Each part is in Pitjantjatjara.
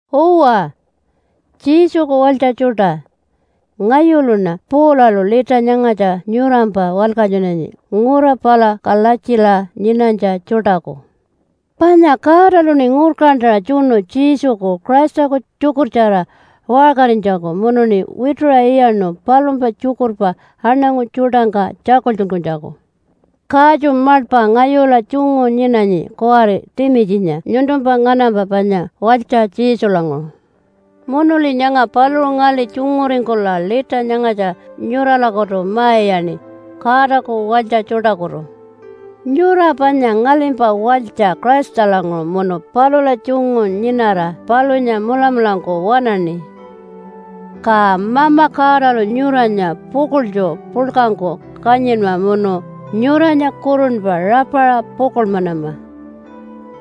Uwa, Jesuku walytja tjuṯa! Ngayuluṉa Paulalu lita nyangatja nyurampa walkatjunanyi ngura pala Kalatjila nyinanytja tjuṯaku. Panya Godaluṉi ngurkantaṟa tjunu Jesuku Christaku tjukurtjara waṟkarinytjaku munuṉi wituṟa iyaṉu palumpa tjukurpa aṉangu tjuṯangka tjakultjunkunytjaku. Katju maḻpa ngayula tjungu nyinanyi kuwari Timitjinya nyuntumpa nganampa panya walytja Jesulanguṟu. Munuli nyanga paluṟu ngali tjunguringkula lita nyangatja nyuralakutu ma-iyaṉi, Godaku walytja tjuṯakutu. Nyura panya ngalimpa walytja Christalanguṟu munu palula tjungu nyinara palunya mulamulangku waṉaṉi. Ka Mama Godalu nyuranya pukuḻtju puḻkangku kanyinma munu nyuranya kurunpa rapaṟa pukuḻmanama.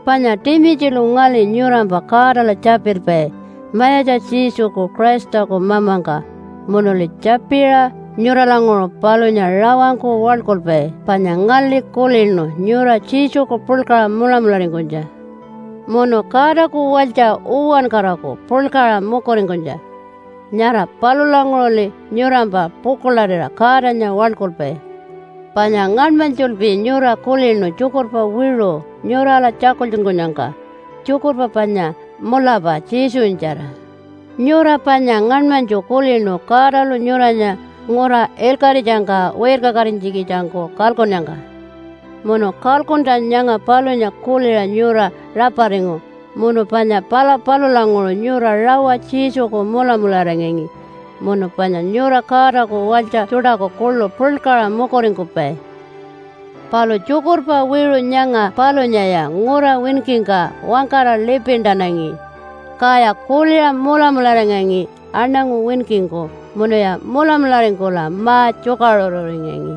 Panya Timitjilu ngali nyurampa Godala tjapilpai, Mayatja Jesuku Christaku Mamangka, munuli tjapiṟa nyuralanguṟu palunya rawangku waḻkulpai panya ngali kulinu nyura Jesuku puḻkaṟa mulamularingkunytja, munu Godaku walytja uwankaraku puḻkaṟa mukuringkunytja. Nyara palulanguṟuli nyurampa pukuḻarira Godanya waḻkulpai. Panya ngaṉmanytjulpi nyura kulinu tjukurpa wiṟu nyurala tjakultjunkunyangka, tjukurpa panya mulapa Jesunyatjara. Nyura panya ngaṉmanytju kulinu Godalu nyuranya ngura ilkaṟitjangka wirkakatinytjikitjangku kalkunnyangka. Munu kalkuntja nyanga palunya kuliṟa nyura raparingu munu panya pala palulanguṟu nyura rawa Jesuku mulamularingangi munu panya nyura Godaku walytja tjuṯaku kuḻu puḻkaṟa mukuringkupai. Palu tjukurpa wiṟu nyanga palunyaya ngura winkingka wangkara lipintanangi, kaya kuliṟa mulamularingangi aṉangu winkingku, munuya mulamularingkula ma-tjukaṟururingangi.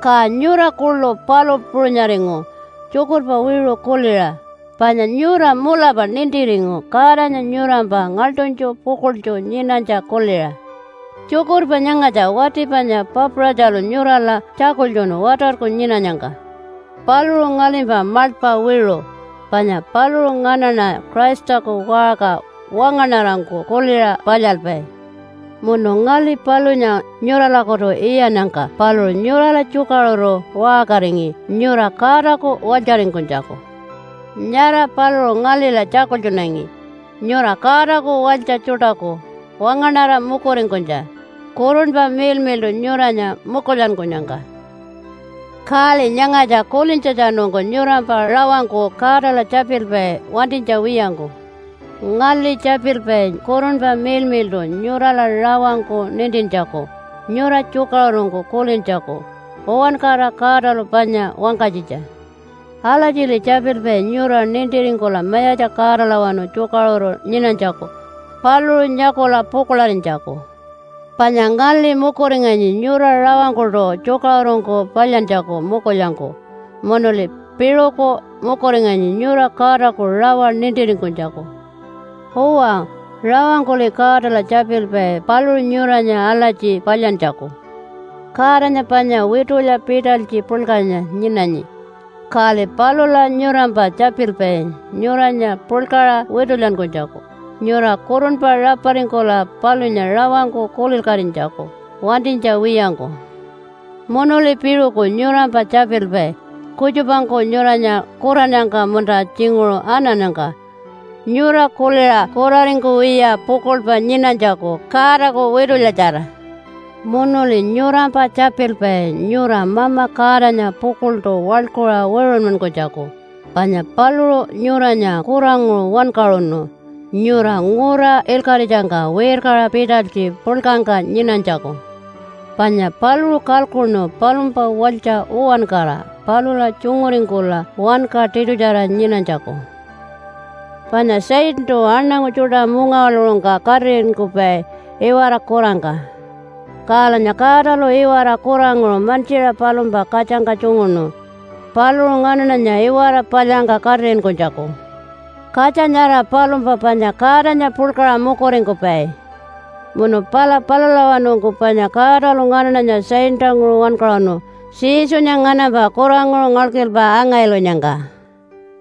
Ka nyura kuḻu palu puṟunyaringu tjukurpa wiṟu kuliṟa, panya nyura mulapa nintiringu Godanya nyurampa ngaḻṯunytju pukuḻtju nyinanytja kuliṟa. Tjukurpa nyangatja wati panya Papaṟatjalu nyurala tjakultjunu watarku nyinanyangka. Paluṟu ngalimpa maḻpa wiṟu panya paluṟu nganaṉa Christaku waṟka wangaṉarangku kuliṟa palyalpai. Munu ngali palunya nyuralakutu iyannyangka paluṟu nyurala tjukaṟuru waṟkaringi nyura Godaku walytjaringkunytjaku. Nyara paluṟu ngalila tjakultjunangi nyura Godaku walytja tjuṯaku wangaṉara mukuringkunytja Kurunpa Miḻmiḻṯu nyuranya mukulyankunyangka. Kali nyangatja kulintjatjanungku nyurampa rawangku Godala tjapilpai wantinytja wiyangku. Ngali tjapilpai Kurunpa Miḻmiḻṯu nyurala rawangku nintintjaku nyura tjukaṟurungku kulintjaku uwankara Godalu panya wangkanytjitja. Alatjili tjapilpai nyura nintiringkula Mayatja Godalawanu tjukaṟuru nyinanytjaku, paluṟu nyakula pukuḻarinytjaku. Panya ngali mukuringanyi nyura rawangkuṯu tjukaṟurungku palyantjaku mukulyangku, munuli piṟuku mukuringanyi nyura Godaku rawa nintiringkunytjaku. Uwa, rawangkuli Godala tjapilpai paluṟu nyuranya alatji palyantjaku. Godanya panya witulya pitalytji puḻkanya nyinanyi, kali palula nyurampa tjapilpai nyuranya puḻkaṟa witulyankunytjaku nyura kurunpa raparingkula palunya rawangku kulilkatinytjaku wantinytja wiyangku. Munuli piṟuku nyurampa tjapilpai kutjupangku nyuranya kurannyangka munta tjinguṟu anannyangka nyura kuliṟa kuraringkuwiya pukuḻpa nyinanytjaku Godaku witulyatjara. Munuli nyurampa tjapilpai nyura Mama Godanya pukuḻṯu waḻkuṟa wiṟunmankunytjaku panya paluṟu nyuranya kuranguṟu wankaṟunu nyura ngura ilkaṟitjangka wirkaṟa pitalytji puḻkangka nyinanytjaku. Panya paluṟu kalkuṉu palumpa walytja uwankara palula tjunguringkula wanka tiṯutjara nyinanytjaku. Panya Satantu aṉangu tjuṯa mungawaḻuṟungka katiṟinkupai iwara kurangka. Kalanya Godalu iwara kuranguṟu mantjiṟa palumpa katjangka tjunguṉu paluṟu nganaṉanya iwara palyangka katiṟinkunytjaku. Katja nyara palumpa panya Godanya puḻkaṟa mukuringkupai. Munu pala palulawanungku panya Godalu nganaṉanya Satantanguṟu wankaṟunu Jesunya nganampa kuranguṟu ngalkilpa anga-ilunyangka,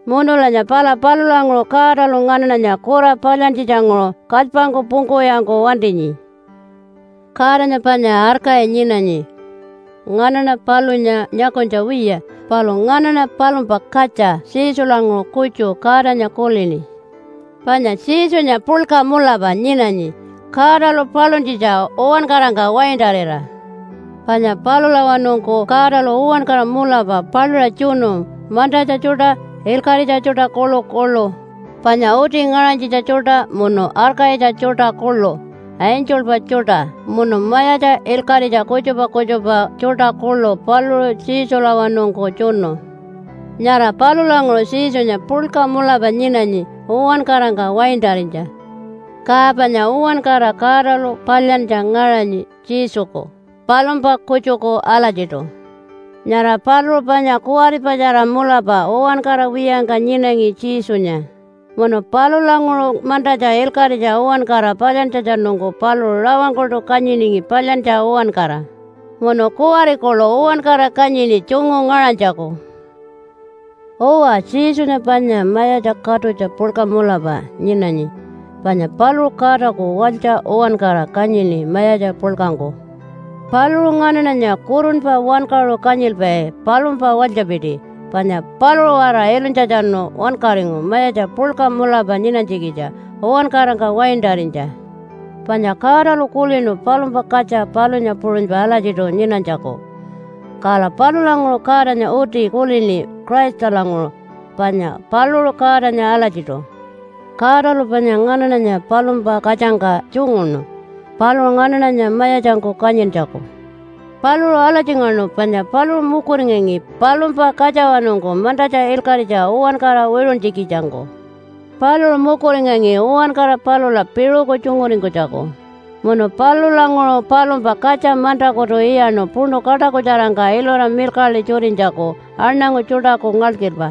munulanya pala palulanguṟu Godalu nganaṉanya kura palyantjitjanguṟu kalypangku pungkuwiyangku wantinyi. Godanya panya arkayi nyinanyi. Nganaṉa palunya nyakunytja wiya, palu nganaṉa palumpa katja Jesulanguṟu kutju Godanya kulini. Panya Jesunya puḻka mulapa nyinanyi Godalu paluntjitja uwankarangka waintarira. Panya palulawanungku Godalu uwankara mulapa paluṟa tjunu mantatja tjuṯa, ilkaṟitja tjuṯa kuḻukuḻu, panya uti ngaṟanytjitja tjuṯa munu arkayitja tjuṯa kuḻu, angelpa tjuṯa, munu mayatja ilkaṟitja kutjupa kutjupa tjuṯa kuḻu paluṟu Jesulawanungku tjunu. Nyara palulanguṟu Jesunya puḻka mulapa nyinanyi uwankarangka waintarinytja. Ka panya uwankara Godalu palyantja ngaṟanyi Jesuku palumpa kutjuku alatjiṯu. Nyara paluṟu panya kuwaripatjara mulapa uwankara wiyangka nyinangi Jesunya, munu palulanguṟu mantatja ilkaṟitja uwankara palyantjatjanungku paluṟu rawangkuṯu kanyiningi palyantja uwankara, munu kuwari kuḻu uwankara kanyini tjungu ngaṟanytjaku. Uwa, Jesunya panya mayatja katutja puḻka mulapa nyinanyi, panya paluṟu Godaku walytja uwankara kanyini mayatja puḻkangku. Paluṟu nganaṉanya kurunpa wankaṟu kanyilpai palumpa walytjapiti, panya paluṟu-waraṟa ilunytjatjanu wankaringu mayatja puḻka mulapa nyinanytjikitja uwankarangka waintarinytja. Panya Godalu kulinu palumpa katja palunya puṟunypa alatjiṯu nyinanytjaku, kala palulanguṟu Godanya uti kulini Christalanguṟu, panya paluṟu Godanya alatjiṯu. Godalu panya nganaṉanya palumpa katjangka tjunguṉu, paluṟu nganaṉanya mayatjangku kanyintjaku. Paluṟu alatjingaṉu panya paluṟu mukuringangi palumpa katjawanungku mantatja ilkaṟitja uwankara wiṟuntjikitjangku. Paluṟu mukuringangi uwankara palula piṟuku tjunguringkunytjaku, munu palulanguṟu palumpa katja mantakutu iyaṉu puṉu kaṯakutjarangka ilura milkaḻi tjutinytjaku aṉangu tjuṯaku ngalkilpa.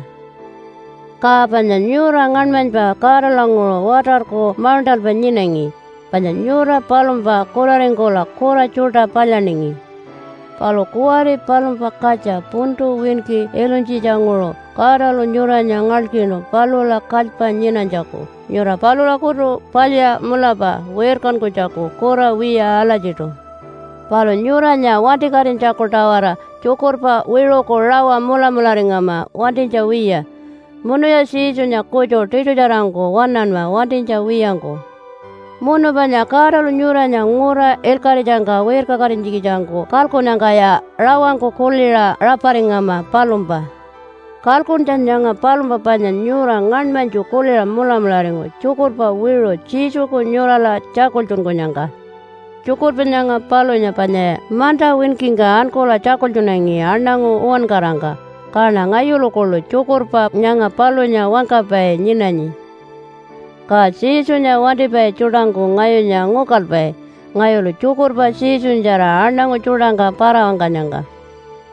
Ka panya nyura ngaṉmanypa Godalanguṟu watarku mauṉṯalpa nyinangi, panya nyura palumpa kuraringkula kura tjuṯa palyaningi. Palu kuwari palumpa katja puntu winki ilunytjitjanguṟu Godalu nyuranya ngalkinu palula kalypa nyinanytjaku, nyura palulakutu palya mulapa wirkankunytjaku kura wiya alatjiṯu. Palu nyuranya wantikatinytjaku-tawara tjukurpa wiṟuku rawa mulamularingama wantinytja wiya. Munuya Jesunya kutju tiṯutjarangku waṉanma wantinytja wiyangku. Munu panya Godalu nyuranya ngura ilkaṟitjangka wirkakatinytjikitjangku kalkunnyangkaya rawangku kuliṟa raparingama palumpa. Kalkuntja nyanga palumpa panya nyura ngaṉmanytju kuliṟa mulamularingu tjukurpa wiṟu Jesuku nyurala tjakultjunkunyangka. Tjukurpa nyanga palunya panyaya manta winkingka ankula tjakultjunangi aṉangu uwankarangka. Kaṉa ngayulu kuḻu tjukurpa nyanga palunya wangkapai nyinanyi. Ka Jesunya wantipai tjuṯangku ngayunya ngukalpai ngayulu tjukurpa Jesunyatjara aṉangu tjuṯangka para-wangkanyangka.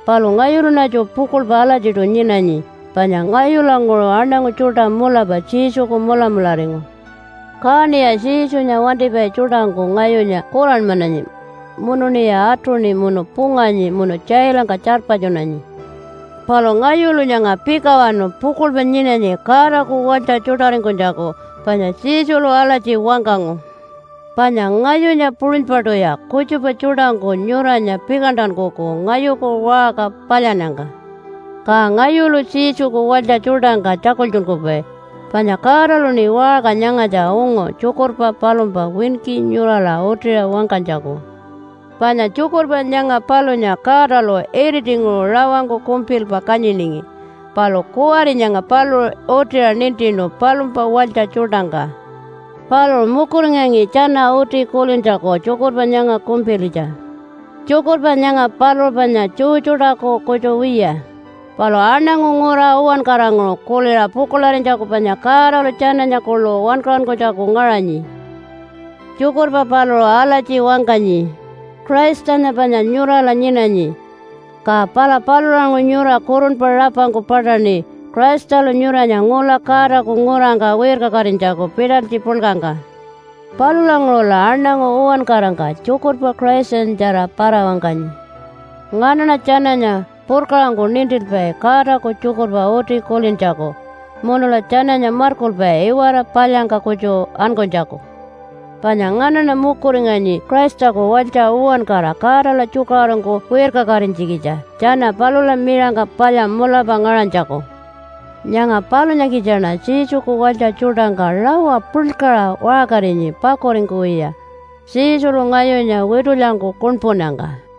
Palu ngayuluṉatju pukuḻpa alatjiṯu nyinanyi, panya ngayulanguṟu aṉangu tjuṯa mulapa Jesuku mulamularingu. Kaṉiya Jesunya wantipai tjuṯangku ngayunya kuranmananyi, munuṉiya atuṉi munu punganyi munu tjailangka tjarpatjunanyi. Palu ngayulu nyanga pikawanu pukuḻpa nyinanyi Godaku walytja tjuṯaringkunytjaku, panya Jesulu alatji wangkangu, “Panya ngayunya puṟunypaṯuya kutjupa tjuṯangku nyuranya pikantankuku ngayuku waṟka palyannyangka.” Ka ngayulu Jesuku walytja tjuṯangka tjakultjunkupai panya Godaluṉi waṟka nyangatja ungu tjukurpa palumpa winki nyurala utiṟa wangkanytjaku. Panya tjukurpa nyanga palunya Godalu iritinguṟu rawangku kumpilpa kanyiningi. Palu kuwari nyanga paluṟu utiṟa nintinu palumpa walytja tjuṯangka. Paluṟu mukuringangi tjana uti kulintjaku tjukurpa nyanga kumpilitja. Tjukurpa nyanga paluṟu panya Jew tjuṯaku kutju wiya, palu aṉangu ngura uwankaranguṟu kuliṟa pukuḻarinytjaku panya Godalu tjananya kuḻu wankaṟunkunytjaku ngaṟanyi. Tjukurpa paluṟu alatji wangkanyi, “Christanya panya nyurala nyinanyi, ka pala palulanguṟu nyura kurunpa rapangku paṯaṉi Christalu nyuranya ngula Godaku ngurangka wirkakatinytjaku pitalytji puḻkangka.” Palulanguṟula aṉangu uwankarangka tjukurpa Christanyatjara para-wangkanyi. Nganaṉa tjananya purkaṟangku nintilpai Godaku tjukurpa uti kulintjaku munula tjananya markulpai iwara palyangka kutju ankunytjaku. Panya nganaṉa mukuringanyi Christaku walytja uwankara Godala tjukaṟurungku wirkakatinytjikitja tjana palula miṟangka palya mulapa ngaṟanytjaku. Nyanga palunyakitjaṉa Jesuku walytja tjuṯangka rawa puḻkaṟa waṟkarinyi pakuringkuwiya, Jesulu ngayunya witulyangku kuṉpunnyangka.